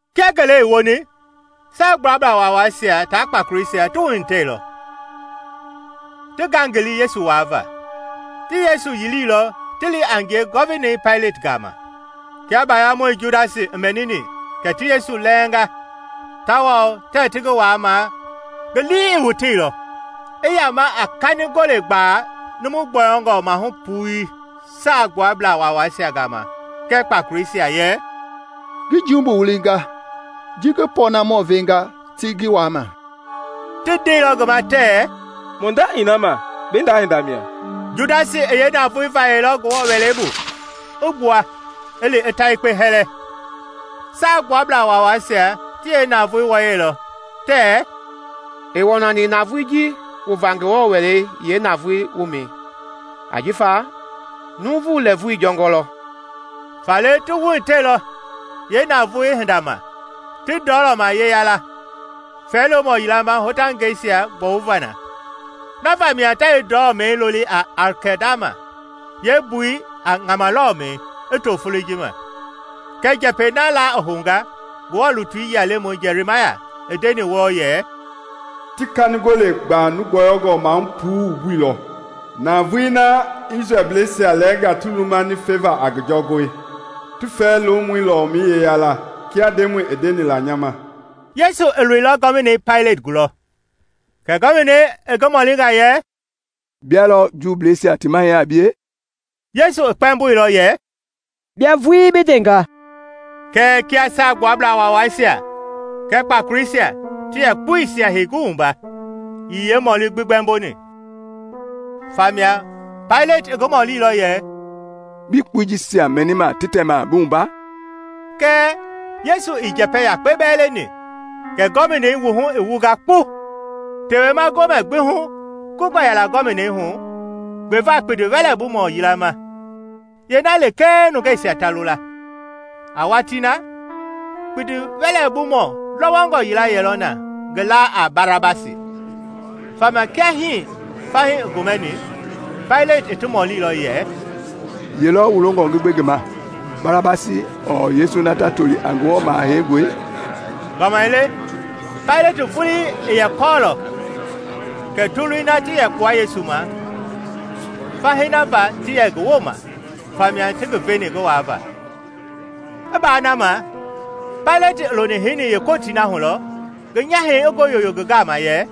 Kia ngele i woni, Saagbuablaa Waawaisia tia kpakoleisia ti wuhitɛilɔ; ti ngangili Yesu waavaa. Ti Yesu yiliilɔ ti li a ngie Gɔvinei Paileti gama. Kia baayamɔi Judasi i mɛnini kɛ ti Yesu lɛɛnga tawao tɛɛ ti ngi waamaa ngi lii i woteilɔ, i yama a kanigole gbaa numu gbɔyɔngɔ maahu puii Saagbuabla Waawaisia gama kɛɛ kpakoleisia, yɛ, “Ngi jumbu wulinga ji ngi pɔɔnamɔɔ venga ti ngi waama.” Ti ndeilɔ ngi ma tɛɛ, “Mu nda ii na ma, bi nda hinda mia.” Judasi i yeenavoei vayɛilɔ Ngewɔ Wɛlei bu, i gbua, i li, i ta yekpe hɛlɛ. Saagbuablaa Waawaisia ti yeenavoei wɔyɛilɔ tɛɛ, “Ii wɔnani navoei ji wuva Ngewɔ Wɛlei yeenavoo wumɛi ajifa nuuvu lɛɛvu jɔngɔ lɔ.” Faale ti wuhitɛilɔ yeenavoei hinda ma, ti ndɔlɔma yeya la fɛɛ-lomɔ yila ma hotangɛisia gbɔwuva na. Na vamia ta yeendɔlɔmɛi loli a Akɛldama, yeembui a “Ŋama Lɔlɔmɛi” i to foloi ji ma. Kɛ njɛpɛi na la i hounga Ngewɔ lutui yia lemɔi Jɛrimaya i ndeni wɔɔ yɛ, “Ti kanigole gbaa numu gbɔyɔngɔ maahu puii wumbuilɔ, navoei na Isrɛlbleisia lɛɛnga ti lumani feva a ngi jɔngɔi, ti fɛɛ-lomɔi lɔlɔmɛi yeya la, kia Ndemɔi i ndeni la nya ma.” Yesu i loilɔ Gɔvinei Paileti gulɔ, kɛ Gɔvinei i ngi mɔlinga yɛ, “Bia lɔ Juubleisia ti Mahɛi a bie?” Yesu i kpɛmboilɔ yɛ, “Bia vulii bi ndenga.” Kɛɛ kia Saagbuablaa Waawaisia kɛɛ kpakoleisia ti yɛ kpuisia hei ngi wumba, ii yeemɔli gbi gbɛmboni. Famia Paileti i ngi mɔlilɔ yɛ, “Bii kpui jisia mɛnima ti tɛma bi wumba?” Kɛɛ Yesu ii njɛpɛ yakpe bɛɛ leni; kɛ Gɔvinei wuhu i wunga kpu. Tewema Gomɛ gbi hu kungɔ yɛla Gɔvinei hu gbeva kpindiwɛlɛbumɔ yila ma, yeena lekee nungeisia ta lo la. A watii na, kpindiwɛlɛbumɔ lɔwɔngɔ yila yɛlɔ na ngi laa a Barabasi. Famia kia fahii ti gomɛni, Paileti i ti mɔlilɔ yɛ, “Ye lɔ wu longɔ ngi gbe ngi ma? Barabasi ɔɔ Yesu na ta toli a Ngewɔ Maha Heingɔi?” Gbamaile Paileti vuii i yɛ kɔɔlɔ kɛ toloi na ti yɛ kpua Yesu ma fahii na va ti yɛ ngi wooma famia ti ngi veni ngi waava. I baa na ma, Paileti i loni heini yeekootii na hu lɔ ngi nyahɛi i ngoo yoyo ngi gama yɛ,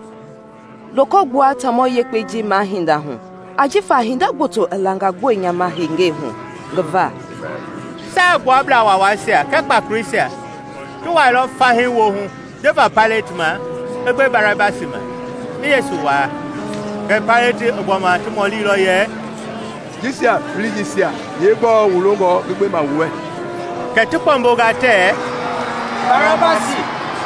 “Loko gbua taamɔ yekpei na mahinda hu ajifa hinda gboto i langa gbue nya ma hengei hu ngi va.” Saagbuablaa Waawaisia kɛɛ kpakoleisia ti wuailɔ fahii woohu ndeva Paileti ma i gbe Barabasi ma, i Yesu waa. Kɛɛ Paileti i gbɔma ti mɔlilɔ yɛ, “Jisia feleisia yeegbɔɔ wu longɔ ngi gbe ma wu wɛ?” Kɛ ti kpɛmbonga tɛɛ, “Barabasi!”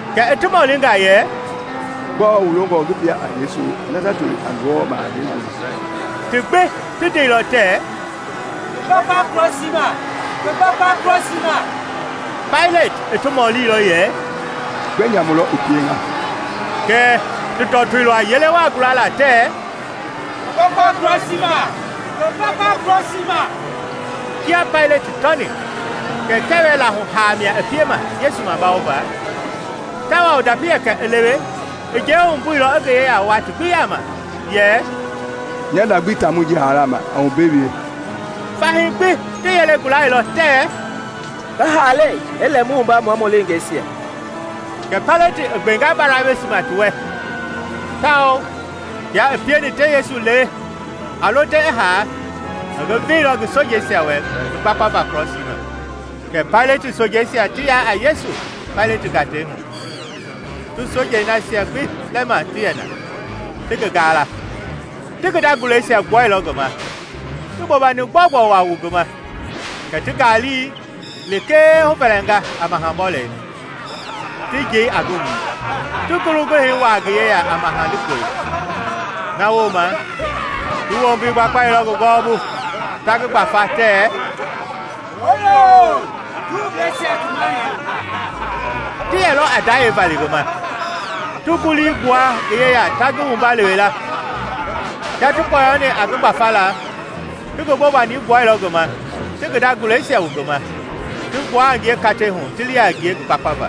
Kɛ i ti mɔlinga yɛ, “Gbɔɔ wu longɔ ngi pie a Yesu na ta toli a Ngewɔ Maha Heingɔi?” Ti gbi ti ndeilɔ tɛɛ, “Ngi gbakpa krɔsii ma!” Paileti i mɔlilɔ yɛ, “Gbɛ nyamu lɔ i pienga?” Kɛɛ ti tɔtoilɔ a yele waa gulala tɛɛ, “Ngi gbakpa krɔsii ma!” Kia Paileti tɔni kɛ kɛwɛ-laahu haa mia i piema Yesu mabawova, tawao ndapi yɛkɛ i lewe, i njɛi wumbuilɔ i ngi yeya wua ti gbi yaama yɛ, “Nya nda gbi ii taamɔi ji haala ma; a wu mbe wie.” Fahii gbi ti yelei gulailɔ tɛɛ, “Ngi haalei i lɛ mu wumba mua mu leengeisia!” Kɛ Paileti i gbenga Barabasi ma ti wɛ, tawao kia i pieni ti Yesu lewe a lo te i haa, i ngi veilɔ ngi sojeisia wɛ ngi gbakpava krɔsii ma. Kɛ Paileti sojeisia ti ya a Yesu Paileti gatei hu, ti sojei nasia gbi lɛma ti yɛ na, ti ngi gaala. Ti ngi nda guleisia gbuailɔ ngi ma, ti bobani gbɔugbɔi waa wu ngi ma. Kɛ ti ngaali lekee huvɛlɛnga a maha-bɔlɛi, ti njei a ngi wui, ti ngulu guhɛi wuaa ngi yeya a maha-likpɔi. Na wooma ti wombi gbakpailɔ ngi gɔwɔbu, ta ngi gbafa tɛɛ, “Hooyoo, Juubleisia ti mahɛi!” Ti yɛlɔ a ndayɛi vali ngi ma, ti ngulii gbua ngi yeya ta ngi wumba lewe la. Kia ti kpɔyɔni a ngi gbafala, ti bobani gbuailɔ ngi ma, ti ngi nda guleisia wu ngi ma, ti gbua a ngie katei hu ti li a ngie ngi gbakpava.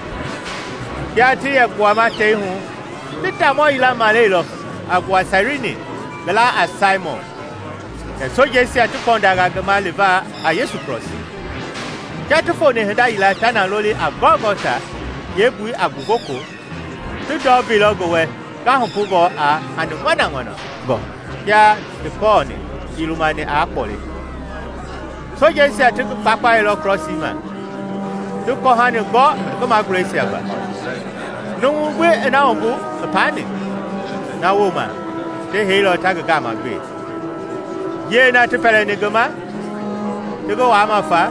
Kia ti yɛ gbuama tei hu, ti taamɔ yila maleilɔ, a gbua Sairini, ngi laa a Saimɔn, kɛ sojeisia ti kpɔndanga ngi ma liva a Yesu krɔsii. Kia ti foni hinda yila ta na loli a Gɔlgɔta (yeembui a Ngugoko), ti ndɔ veilɔ ngi wɛ ngahupungɔ a hani ŋɔnaŋɔnangɔ, kɛɛ kia i kɔɔni, ii lumani aa kpɔle. Sojeisia ti ngi gbakpailɔ krɔsii ma, ti kɔhani gɔ ngi maguleisia va, numu gbi i na wumbu i paani. Na wooma ti heilɔ ta ngi gaama gbe. Njiɛi na ti pɛlɛni ngi ma, ti ngi waama fa,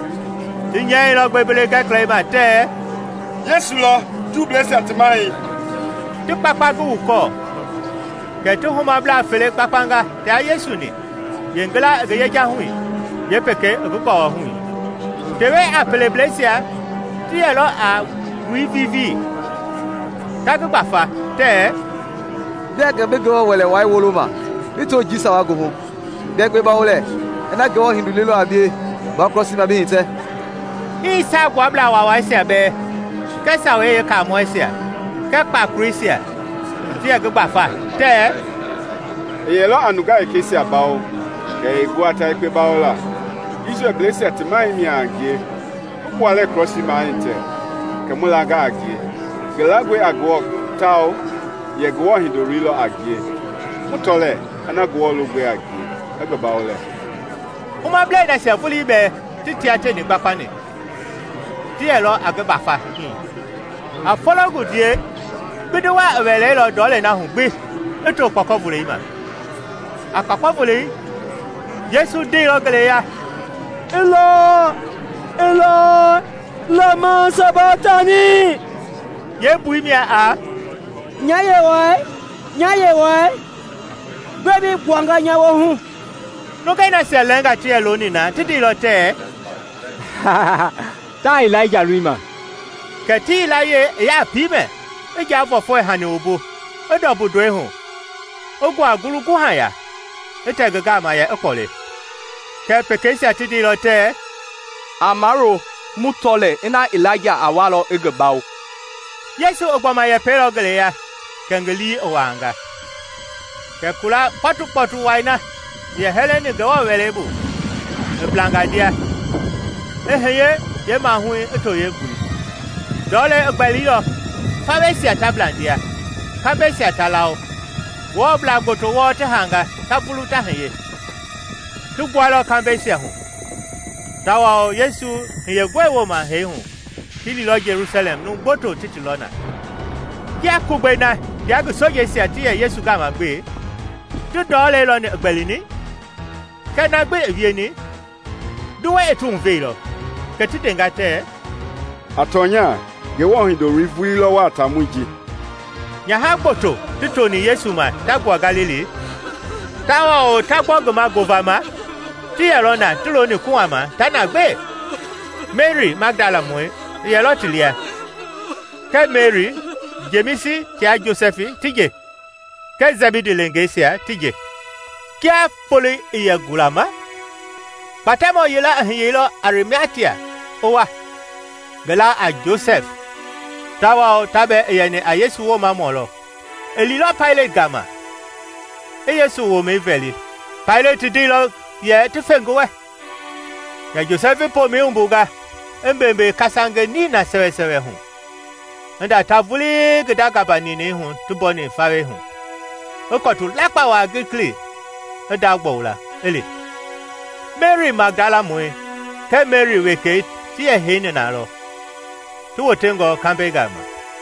ti nyɛilɔ gbembele-gɛkɛlɛi ma tɛɛ, “Yesu lɔ, Juubleisia Ti Mahɛi,” ti kpakpa ngi wukɔɔ. Kɛ ti humablaa fele gbakpanga tia Yesu-ni, yeengila i ngi yejahui, yeepekei i ngi gɔwɔhui. Tewe-a-pelebleisia ti yɛlɔ a ti wui vivii, ta ngi gbafa, tɛɛ, “Bia gɛ bi Ngewɔ Wɛlei Wai woloma bi to njii sawa goohu, bia yekpe bawo lɛɛ! Ina Ngewɔ Hindoloi lɔ a bie, gbua krɔsii ma bi hitɛ.” Hii Saagbuablaa Waawaisia bɛɛ kɛɛ Sawei Yeekaamɔisia kɛɛ kpakoleisia ti yɛ ngi gbafa tɛɛ, “I yɛlɔ a nungaa wekeisia bawo kɛɛ ɛɛ gu a ta yekpe bawola. Isrɛlblɛisia ti Mahɛi mia a ngie; i gbua lɛɛ krɔsii ma i hitɛ, kɛ mu langa a ngie. Ngi langɔe a Ngewɔ tawao yɛ Ngewɔ Hindoloi lɔ a ngie. Mu tɔ lɛɛ na ina Ngewɔ longɔi a ngie i ngi bawo lɛ.” Humablɛi nasia vulii bɛɛ ti tia tieni gbakpani ti yɛlɔ a ngi gbafa hii. A fologundiei, kpindi waa i wɛleilɔ ndɔlei na hu gbi i to kpɔkɔvolei ma. A kpɔkɔvolei, Yesu ndeilɔ ngeleya yɛ, “Ilai, Ilai, lama sabaktani?” yeembui mia a “Nya Yewɔɛi, nya Yewɔɛi, gbɛe bi gbuanga nya woohu?” Nungei nasia lɛɛnga ti yɛ looni na ti ndeilɔ tɛɛ, “Taa Ilaija lolima!” Kɛ ti yilayee i ya a piimɛ, i njavɔɛfɔɛ-hani wumbu, i ndɔmbu ndɔi hu, i nguaa ngulu-guha ya, i tɛ ngi gama yɛ i kpɔle. Kɛɛ pekeisia ti ndeilɔ tɛɛ, “A mawulo, mu tɔ lɛɛ ina Ilaija a walɔ i ngi bawo.” Yesu i gbɔma yɛpɛilɔ ngeleya kɛ ngi lii i wuaanga. Kɛ kula kpɔtukpɔtu wai na i yɛ hɛlɛni Ngewɔ Wɛlei Wai bu i blanga ndia, i hiye yeemaahui i to yeembui; ndɔlei i gbɛlilɔ, faweisia ta bla ndia, kambɛisia ta lawo, Ngewɔblaa gboto wɔɔ ti haanga ta vulu ta hiye. Ti gbuailɔ kambɛisia hu; tawao Yesu hiyengɔi wooma hee hu, ti liilɔ Jelusalɛm numu gboto ti ti lɔ na. Kia Kugbei na tia ngi sojeisia ti yɛ Yesu gama gbe ti ndɔlei lɔni i gbɛlini, kɛɛ na gbi i wieni, nduwɛi i ti huveilɔ, kɛ ti ndenga tɛɛ, “A tɔnya, Ngewɔ Hindoloi vulii lɔ wɔɔ a taamɔi ji!” Nyaha gboto ti toni Yesu ma ta gbua Galili, tawao ta gbɔ ngi ma ngovama, ti yɛlɔ na ti looni kuhama ta na gbe. Meri Magdalamɔi i yɛlɔ ti lia, kɛɛ Meri, Jemisi tia Josɛfi ti nje, kɛɛ Sɛbidi leengeisia ti nje. Kia foloi i yɛ gulama, Kpatɛmɔ yila i hiyeilɔ Arimatia i wa, ngi laa a Josɛfi, tawao ta bɛɛ i yɛni a Yesu woomamɔ lɔ. I liilɔ Paileti gama, i Yesu womɛi vɛli. Paileti i ndeilɔ yɛ ti fe ngi wɛ. Kɛ Josɛfi i pomɛi wumbunga, i mbeembee kasange nina sɛwɛsɛwɛ hu, i nda ta vulii ngi nda gamba ninɛi hu ti mbɔni fawei hu, i kɔtu lakpa waa gilikili i ndagbɔwu la, i li. Meri Magdalamɔi kɛɛ Meri wekei ti yɛ heini na lɔ, ti wotengɔ kambɛi gama.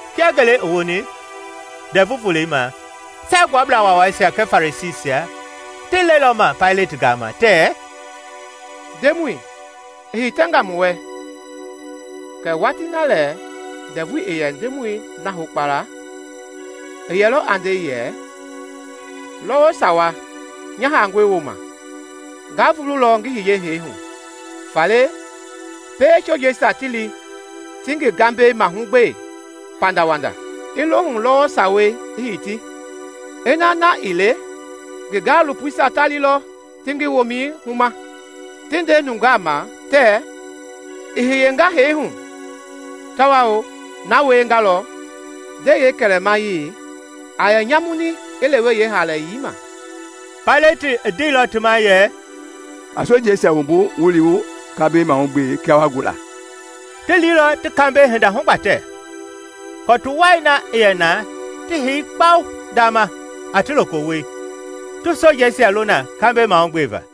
Kia ngele i woni, Ndɛvu Volei ma, Saagbuablaa Waawaisia kɛɛ Farisiisia ti lɛilɔ ma Paileti gama tɛɛ, “Ndemɔi, i hitɛnga mu wɛ kɛ watii lɛ ndɛvu i yɛ ndɛɛmɔi na hokpala, i yɛlɔ a nde yɛ, ‘Lɔwɔ sawa nya haangɔi wooma, nga vululɔ ngi hiye hee hu.’ Faale, pie sojeisia ti li ti ngi gambɛi mahugbe pandawanda i lohu lɔwɔ sawei i hiti, ina na ii le ngi gaalopoisia ta lilɔ ti ngi womɛi huma, ti nde nungeisia ma tɛɛ, ‘I hiyenga hee hu,’ tawao na wiengalɔ, ndɛi yeekɛlɛmayei a yɛ nyamuni yeehaalayei ma.” Paileti i ndeilɔ ti ma yɛ, “A sojeisia wumbu, wu li wu kambɛi mahugbe kia wa gu la.” Ti liilɔ ti kambɛi hinda hugbatɛ, kɔtu wai na i yɛ na ti hei kpa uŋ ndama a ti lokowoi, ti sojeisia lo na kambɛi mahugbeva.